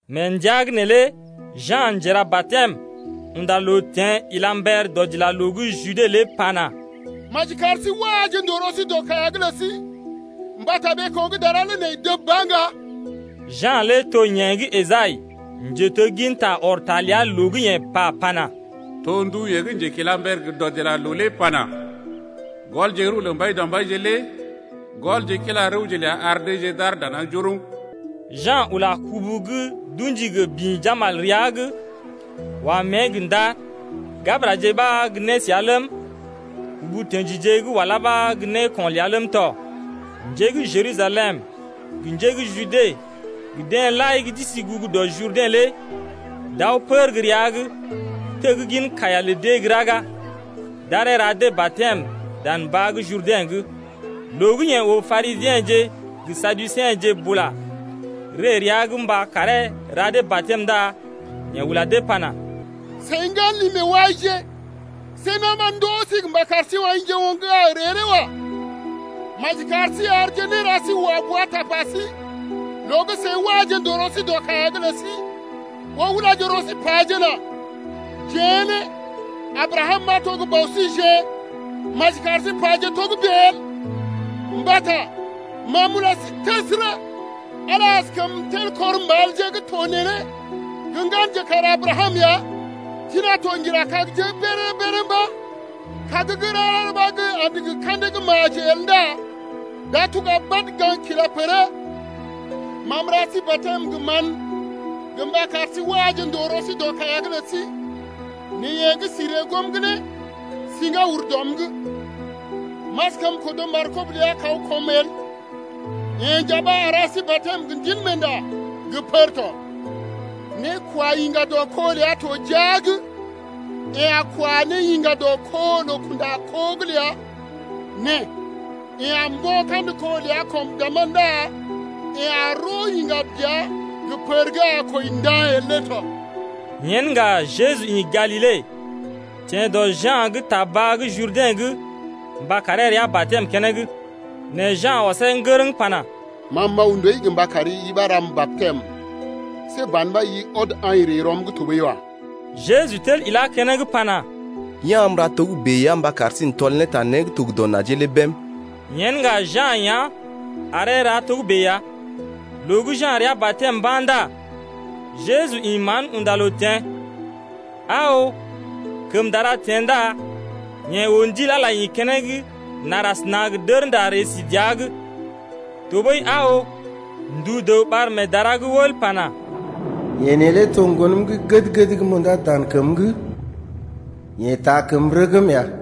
Mee ndəa’g neelé Ja̰ Njera-batɛm unda loo teḛ ila mber dɔdilaloo gə́ Jude lé pana: Maji kar sí waje ndòo rɔ sí dɔ kaiya’g lə sí mbata ɓeeko̰ gə́ dara lé nai dəb ba ŋga. Ja̰ lé to yeḛ gə́ Esai, njetegginta ɔr ta ləa loo gə́ yeḛ pa ne pana: To ndu yeḛ gə́ njekilamber gə dɔdilaloo lé pana: Gɔlje rəw lə Mbaidɔmbaije lé Gɔlje kila rəwje ləa ar deeje d’aar dana njoroŋ. Ja̰ ula kubu gə́ d’ṵji gə bḭ jambal rəa’g, wa mée gə ndar. Gabəraje ɓa gə́ nésəa ləm, ubu tə̰jije gə́ walá ɓa gə́ néko̰ ləa ləm tɔ. Njé gə́ Jerusalem gə njé gə́ Jude gə deḛ lai gə́ d’isi gugu dɔ Jurdɛ̰ lé d’aw pər gə́ rəa’g, teggin kaiya lə dee gə́ raga. D’aree ra dee batɛm dan baa gə́ Jurdɛ̰’g. Loo gə́ yeḛ oo Parisiḛje gə Saduseḛje bula ree rəa’g mba karee ra dee batɛm lé ndá yeḛ ula dee pana: Seḭ ŋgan li-meewaije, see na̰ ɓa ndoo sí mba kar sí aḭje oŋg gə́ a gə ree lé wa. Maji kar sí arje néra sí wa bua tapa sí loo gə́ seḭ waje ndòo rɔ sí dɔ kaiya’g lə sí ɓó ulaje rɔ sí pajena: Jeḛ lé Abrakam ɓa to gə́ bɔ síjeḛ, maji kar sí paje togə́bè el! Mbata ma m’ula sí təsərə, Ala askəm tel kɔr mbalje gə́ to neelé gə́ ŋganje kar Abrakam ya. Tina to ŋgira kagje’g béréré-béréré mba̰. Kag gə́ rara ɓa gə́ andə gə ka̰dee gə́ maji el ndá d’a tuga badə gaŋg kila pər’d. Ma m’ra sí batɛm gə mán gə mba kar sí waje ne ndòo rɔ sí dɔ kaiya’g lə sí nɛ yeḛ gə́ si ree goom’g lé siŋgá ur dɔm’g, m’askəm kodo markob ləa lé kaw kɔm el. Yeḛ nja ɓa a ra sí batɛm gə Ndilmeenda gə pər tɔ. Nékwayiŋga dɔ kó ləa to jia’g. Yeḛ a kwa ne yiŋga dɔ kó loo-kunda-kó’g ləa nɛ yeḛ a mbo̰ kandə kó ləa kɔm dàmá ndá yeḛ a roo yiŋga dəa gə pər gə́ a kwəi nda̰ el lé tɔ. Yen ŋga Jeju ḭ Galile teḛ dɔ Ja̰’g ta baa gə́ Jurdɛ̰’g mba karee rəa batɛm keneŋ, Nɛ Ja̰ ɔsee ŋgərəŋ pana: Ma m’aw ndooi gə mba kari ɓa ram batɛm. See ban ɓa i ɔd aḭ ree rɔm’g tɔɓəi wa. Jeju tel ilá keneŋ pana: Ya̰ am m’ra togə́bè ya mba kar sí n’tɔl ne ta né gə́ to gə dɔ najee lé bém. Yen ŋga Ja̰ yá̰ aree rəa togə́bè ya. Loo gə́ Ja̰ rəa batɛm mba̰ ndá Jeju ḭ mán unda loo teḛ. Aa oo, kəm dara teḛ ndá yeḛ oo Ndil Ala ḭ keneŋ nar asəna gə dərnda ree si dəa’g. Tɔɓəi aa oo, ndu dəw ɓar mee dara’g wəl pana: Yeḛ neelé to ŋgonəm gə́ gəd-gəd gə́ m’undá dan kəm’g, yeḛ taa kəm rəgm ya.